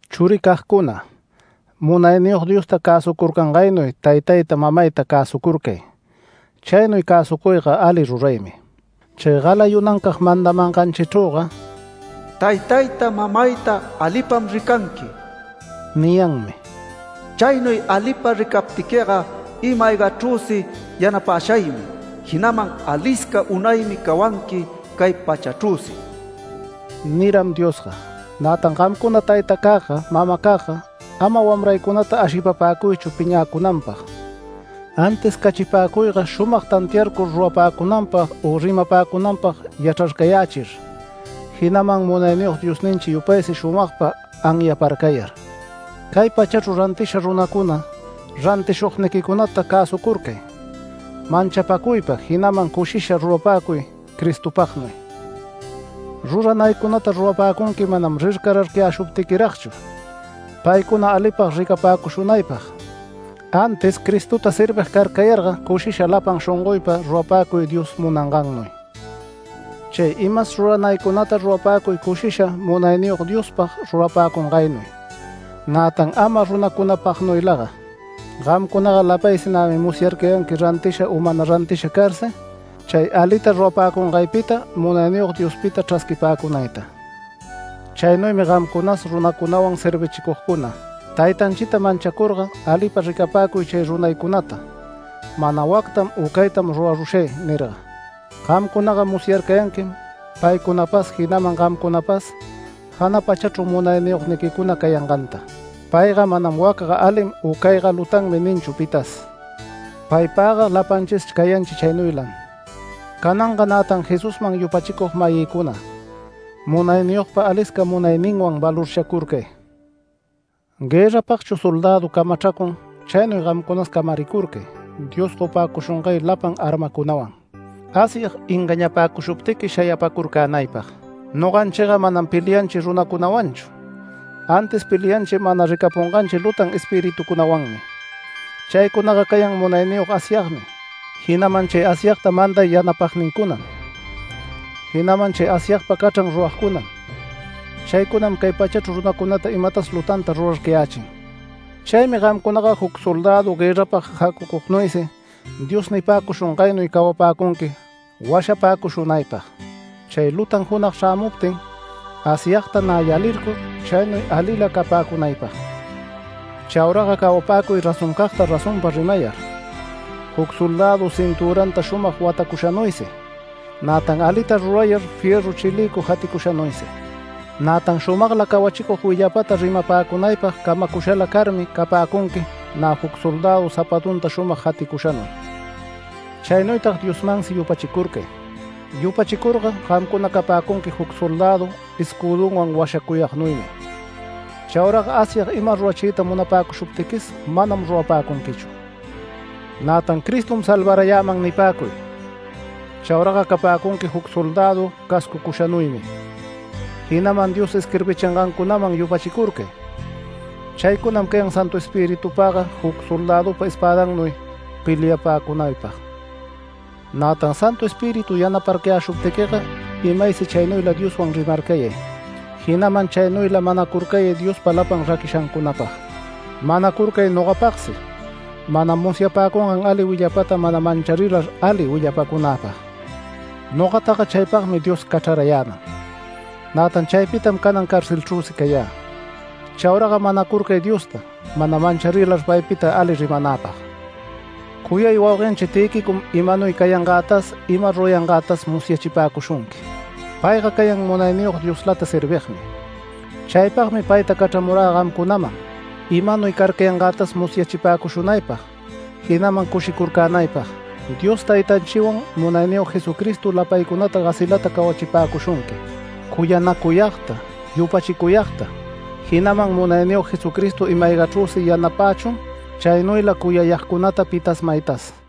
Churicagcuna, Munayniyog Diosta cäsucurcangaynuy taytayta, mamayta cäsucurcay. Chaynuy cäsucuyga ali ruraymi. Chay galayunancag mandamanganchichrüga “Taytayta mamayta alipam ricanqui” niyanmi. “Chaynuy alipa ricaptiquiga ima-aygachrüsi yanapäshaymi, jinaman alisca unaymi cawanqui cay pachachrüsi” niram Diosga. Nätan gamcuna taytacagga, mamacagga, ama wamraycunata ashipapäcuychu piñäcunanpag, antis cachipäcuyga shumag tantiarcur rurapäcunanpag u rimapäcunanpag yachrarcayächir, jinaman Munayniyog Diosninchi yupaysi shumagpa anyaparcayar. Cay pachachru rantisha runacuna, rantishugniquicunata cäsucurcay manchapäcuypa, jinaman cushisha rurapäcuy Cristopagnuy. Ruranaycunata rurapäcunqui manam rircararcayäshuptiquiragchu paycuna alipag ricapäcushunaypag, antis Cristota servig carcayarga cushisha lapan shongoypa rurapäcuy Dios munangannuy. Chay imas ruranaycunata rurapäcuy cushisha Munayniyog Diospag rurapäcungaynuy, nätan ama runacunapagnuylaga. Gamcunaga lapaysi nämi musyarcayanqui rantisha u mana rantisha carsi chay alita rurapäcungaypita Munayniyog Diospita chrasquipäcunayta. Chaynuymi gamcunas, runacunawan servichicugcuna, taytanchita manchacurga alipa ricapäcuy chay runaycunata mana “Wactam u caytam rurarushay” nirga. Gamcunaga musyarcayanquim paycunapas jinaman gamcunapas jana pachachru munayniyogniquicuna cayanganta. Payga manam “Wacga alim u cayga lutanmi” ninchu pitas. Paypagga lapanchis cayanchi chaynuylam. Cananga nätan Jesusman yupachicug-mayïcuna, munayniyogpa alisca munayninwan valorchacurcay. Guërrapagchu soldädu camachracun chaynuy gamcunas camaricurcay Dios gopäcushungay lapan armacunawan Asyag engañapäcushuptiqui shayapacurcänaypag. Noganchiga manam pelianchi runacunawanchu, antis pelianchi mana ricapunganchi lutan espirituncunawanmi. Chaycunaga cayan munayniyog Asyagmi, jinaman chay Asyagta manday yanapagnincunam, jinaman chay Asyagpa cachran ruragcunam. Chaycunam cay pachachru runacunata imatas lutanta rurarcayächin. Chaymi gamcunaga juc soldädu guërrapag jacucugnuysi Dios nipäcushungaynuy cawapäcunqui washapäcushunaypag, chay lutan junag chrämuptin, Asyagta nä yalircur, chaynuy alila capäcunaypag. Chauraga cawapäcuy razoncagta razonpa rimayar, juc soldädu cintüranta shumag watacushanuysi, nätan alita rurayar fierru chilïcu jaticushanuysi. Nätan shumagla cawachicug willapata rimapäcunaypag camacushala carmi capäcunqui nä juc soldädu zapatunta shumag jaticushanuy. Chaynuytag Diosmansi yupachicurcay. Yupachicurga gamcuna capäcunqui juc soldädu escüdunwan washacuyagnuymi. Chauraga Asyag ima rurachiyta munapäcushuptiquis manam rurapäcunquichu. Nätan “Cristom salvarayäman” nipäcuy, chauraga capäcunqui juc soldädu cascucushanuymi, jinaman Dios isquirbichingancunaman yupachicurcay, chaycunam cayan Santu Espiritupagga juc soldädupa espädannuy peliapäcunaypag. Nätan Santu Espíritu yanaparcayäshuptiquiga imaysi chaynuyla Dioswan rimarcayay. Jinaman chaynuyla manacurcayay Diospa lapan raquishancunapag. Manacurcay nogapagsi, mana musyapäcungan ali willapata mana mancharilar ali willapäcunäpag. Nogataga chaypagmi Dios cachrarayäman. Nätan chaypitam canan carcelchrüsi cayä. Chauraga manacurcay Diosta, mana mancharilar paypita ali rimanäpag. Cuyay wauguenchi Tïquicom imanuy cayangätas ima rurayangätas musyachipäcushunqui. Payga cayan Munayniyog Dioslata servigmi. Chaypagmi payta cachramurä gamcunaman, imanuy carcayangätas musyachipäcushunaypag jinaman cushicurcunaypag. Dios Taytanchiwan Munayniyog Jesucristo lapaycunata gasilata cawachipäcushunqui, cuyanacuyagta, yupachicuyagta. Jinaman Munayniyog Jesucristo ima-aygachrüsi yanapächun chaynuyla cuyayagcunata pitas maytas.